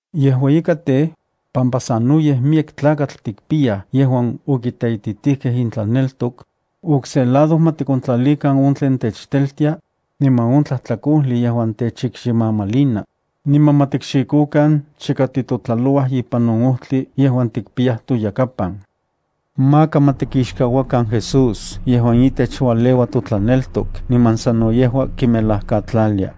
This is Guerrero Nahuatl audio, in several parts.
Yejua ika tej, pampa sanoyej miyek tlakatl tikpiyaj yejuan okiteititijkej intlaneltok, okse lado ma tikontlalikan on tlen techteltia, niman on tlajtlakojli yejuan techikximamalina, niman ma tikxikokan chika titotlalouaj ipan on ojtli yejuan tikpiyaj toyakapan. Ma tikixkechikan Jesús yejuan itech ualeua totlaneltok niman sano yejua kimelajkatlalia.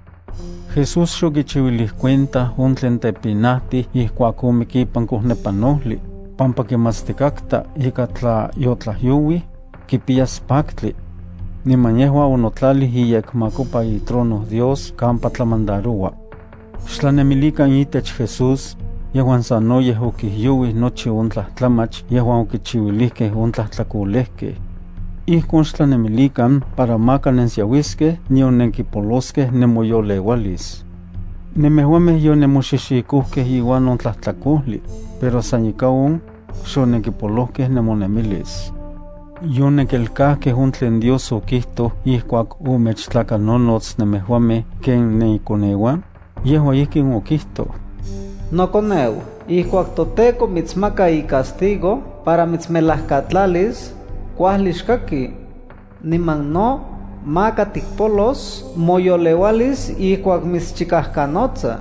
Jesús xokichiuilij cuenta on tlen tepinajtij ijkuak omik ipan kojnepanojli, pampa kimatstikatka ika tla yotlajyouij, kipiyas paktli. Niman yejua onotlalij iyekmakopa itrono Dios kampa tlamandaroua. Xtlanemilikan itech Jesús, yejuan sanoyej okijyouij nochi on tlajtlamach yejuan okichiuilijkej on tlajtlakolejkej. Ijkon xtlanemilikan para maka nensiauiskej nion nenkipoloskej nemoyoleualis. Nemejuamej yonenmoxixikojkej iuan on tlajtlakojli, pero san ika on, xonenkipolojkej nemonemilis. ¿Yonenkelkajkej on tlen Dios okijtoj ijkuak omechtlakanonots nemejuamej ken nenikoneuan? Yejua ijkin okijtoj: Nokoneu, ijkuak toTEKO mitsmaka icastigo para mitsmelajkatlalis, kuajli xkaki. Niman no, maka tikpolos moyoleualis ijkuak mitschikajkanotsa,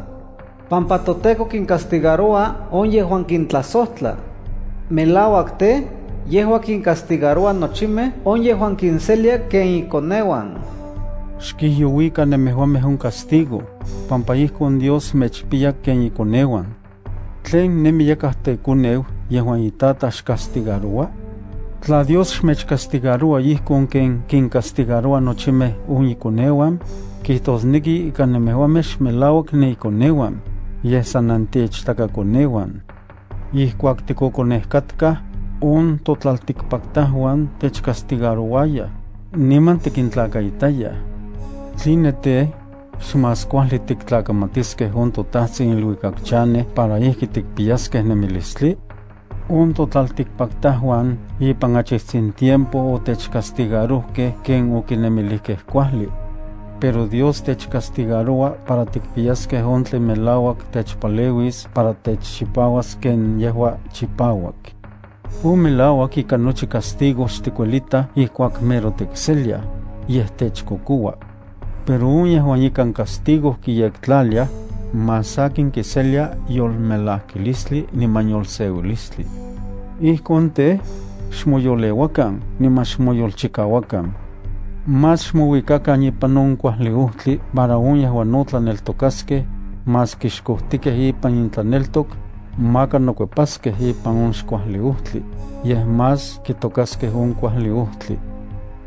pampa toTEKO kincastigaroua on yejuan kintlajsojtla. Melauak tej, yejua kincastigaroua nochimej on yejuan kinselia ken ikoneuan. Xkijyouikan nemejuamej on castigo, pampa ijkon Dios mechpiya ken ikoneuan. ¿Tlen nemi yakaj tekoneu yejuan itataj xcastigaroua? Tla Dios xmechcastigaroua ijkon ken kincastigaroua nochimej on ikoneuan, kijtosneki ika nemejuamej xmelauak nenikoneuan, yej san nenteichtakakoneuan. Ijkuak tikokonej katkaj, on totlaltikpaktajuan techcastigarouayaj, niman tikintlakaitayaj. ¿Tline tej, xmás kuajli tiktlakamatiskej on toTajtsin iluikak chanej para ijki tikpiyaskej nemilistli? On totlaltikpaktajuan ipan achitsin tiempo otechcastigarojkej ken okinemilijkej kuajli. Pero Dios techcastigaroua para tikpiyaskej on tlen melauak techpaleuis para techchipauas ken yejua chipauak. On melauak ika nochi castigo xtikuelitaj ijkuak mero tikseliaj, yej techkokoua. Pero on yejuan ikan castigo noyektlaliaj, más sakin kiseliaj yolmelajkilistli niman yolseuilistli. Ijkon tej, xmoyoleuakan niman xmoyolchikauakan. Más xmouikakan ipan on kuajli ojtli para on yejuan xkojtikej ipan intlaneltok, maka nokuepaskej ipan on xkuajli ojtli, yej más kitokaskej on kuajli ojtli.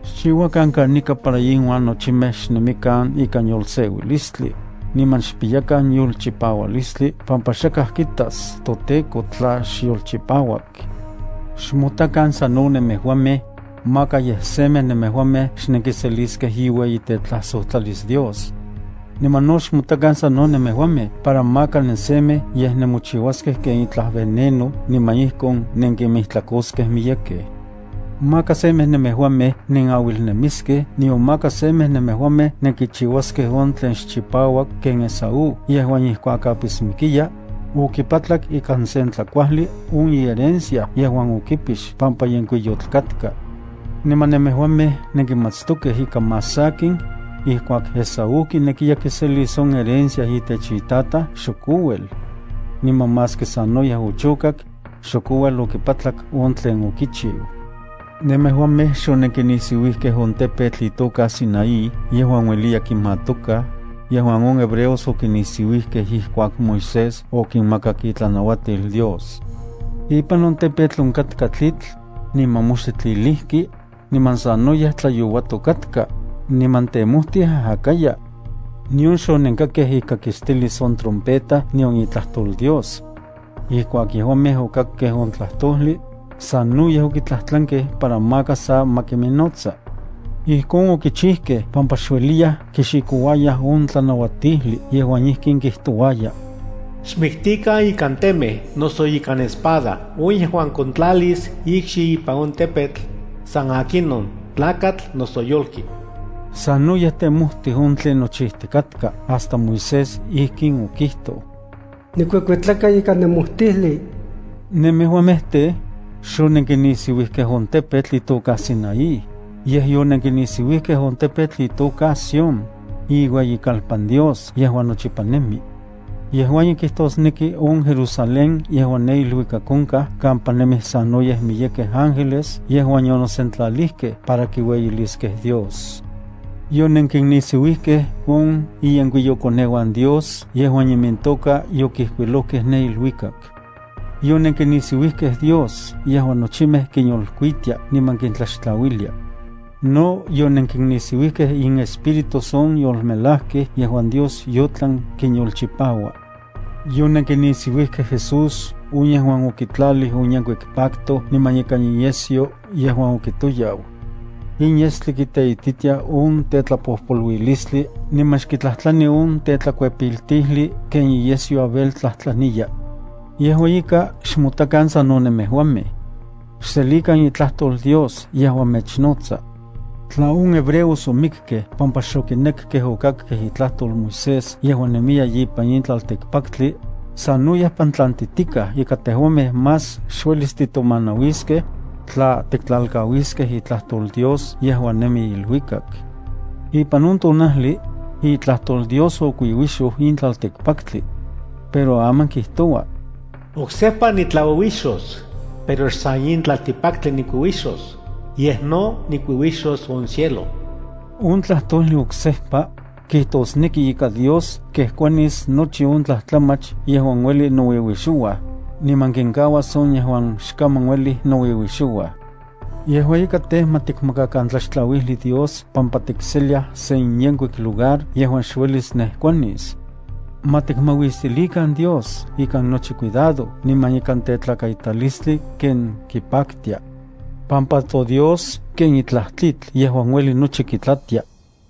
Xchiuakan kanika para inuan nochimej xnemikan ikan yolseuilistli, niman xpiyakan yolchipaualistli pampa xakaj kitas toTEKO tla xyolchipauak. Xmotakan sano nemejuamej, maka yej semej nemejuamej xnenkiseliskej iueyitetlajsojtlalis Dios. Niman no xmotakan sano nemejuamej para maka nensemej yej nenmochiuaskej ken itlaj veneno niman ijkon nenkinmijtlakoskej miyekej. Maka semej nemejuamej nenauilnemiskej nion maka semej nemejuamej nenkichiuaskej on tlen xchipauak ken Esaú yejuan ijkuak apismikiya, okipatlak ikan sen tlakuajli on iherencia yejuan okipix pampa yenkuiyotl katka. Niman nemejuamej nenkimatstokej ika más sakin, ijkuak Esáu kinekiya kiselis on herencia itech itataj, xok ouel. Niman maski sanoyej ochokak, xok ouel okipatlak on tlen okikiu. Nemejuamej xonenkinisiuijkej on tepetl itoka Sinaí yejuan se ueli kimatoka yejuan on hebreos okinisiuijkej ijkuak Moisés okinmakak itlanauatil Dios. Ipan on tepetl onkatka tlitl, niman moxtli tlilijki, niman sanoyej tlayouatok katka, niman temojtij ajakaya, nion xonenkakej ikakistilis on trompeta nion itlajtol Dios. Ijkuak yejuamej okakkej on tlajtojli, sanoyej okitlajtlankej para maka sa ma kiminnotsa. Ijkon okichijkej pampa xueliyaj kixikouayaj on tlanauatijli yejuan ijkin kijtouaya: “Xmiktikan ikan temej noso ikan espada on yejuan kontlalis ikxi ipan on tepetl, san akinon tlakatl noso yolki.” Sanoyej temojtij on tlen nochijtikatka hasta Moisés ijkin okijtoj: “Nikuekuetlaka ikan nemojtijli.” Nemejuamej tej, xonenkinisiuijkej on tepetl itoka Sinaí, yej yonenkinisiuijkej on tepetl itoka Sión, iueyikalpan Dios yejuan nochipa nemi. Yejua in kijtosneki on Jerusalén yejuan ne iluikak onkaj kampa nemij sanoyej miyekej ángeles yejuan yonosentlalijkej para kiueyiliskej Dios. Yonenkinnisiuijkej on iyenkuiyokoneuan Dios yejuan imintoka yokijkuilojkej ne iluikak. Yonenkinisiuijkej Dios yejuan nochimej kinyolkuitia niman kintlaxtlauilia. No yonenkinnisiuijkej inespíritus on yolmelajkej yejuan Dios yotlan kinyolchipaua. Yonenkinisiuijkej Jesús on yejuan okitlalij on yenkuik pacto niman ikan iyesyo yejuan okitoyau. In yestli kiteititia on tetlapojpoluilistli niman xkitlajtlani on tetlakuepiltijli ken iyesyo Abel tlajtlaniya. Yejua ika, xmotakan sano nemejuamej. Xselikan itlajtol Dios yejuan mechnotsa. Tla on hebreos omikkej pampa xokinekej okakej itlajtol Moisés yejuan nemiya ipan in tlaltikpaktli, sanoyej pantlantijtikaj ika tejuamej más xuelis titomanauiskej, tla tiktlalkauiskej itlajtol Dios yejuan nemi iluikak. Ipan on tonajli, itlajtol Dios okuiuixoj in tlaltikpaktli. Pero aman kijtoua: “Oksejpa nitlauiuixos, pero xsan in tlaltikpaktli nikuiuixos, yej no nikuiuixos on cielo.” On tlajtojli “oksejpa”, kijtosneki ika Dios kejkuanis nochi on tlajtlamach yejuan uelij nouiuixouaj, niman kinkauas on yejuan xkaman uelij nouiuixouaj. Yejua ika tej, ma tikmakakan tlaxtlauijli Dios pampa tikseliaj sen yenkuik lugar yejuan xuelis nejkuanis. Ma tikmauistilikan Dios ikan nochi cuidado niman ikan tetlakaitalistli ken kipaktia, pampa toDios ken itlaj tlitl yejuan ueli nochi kitlatia.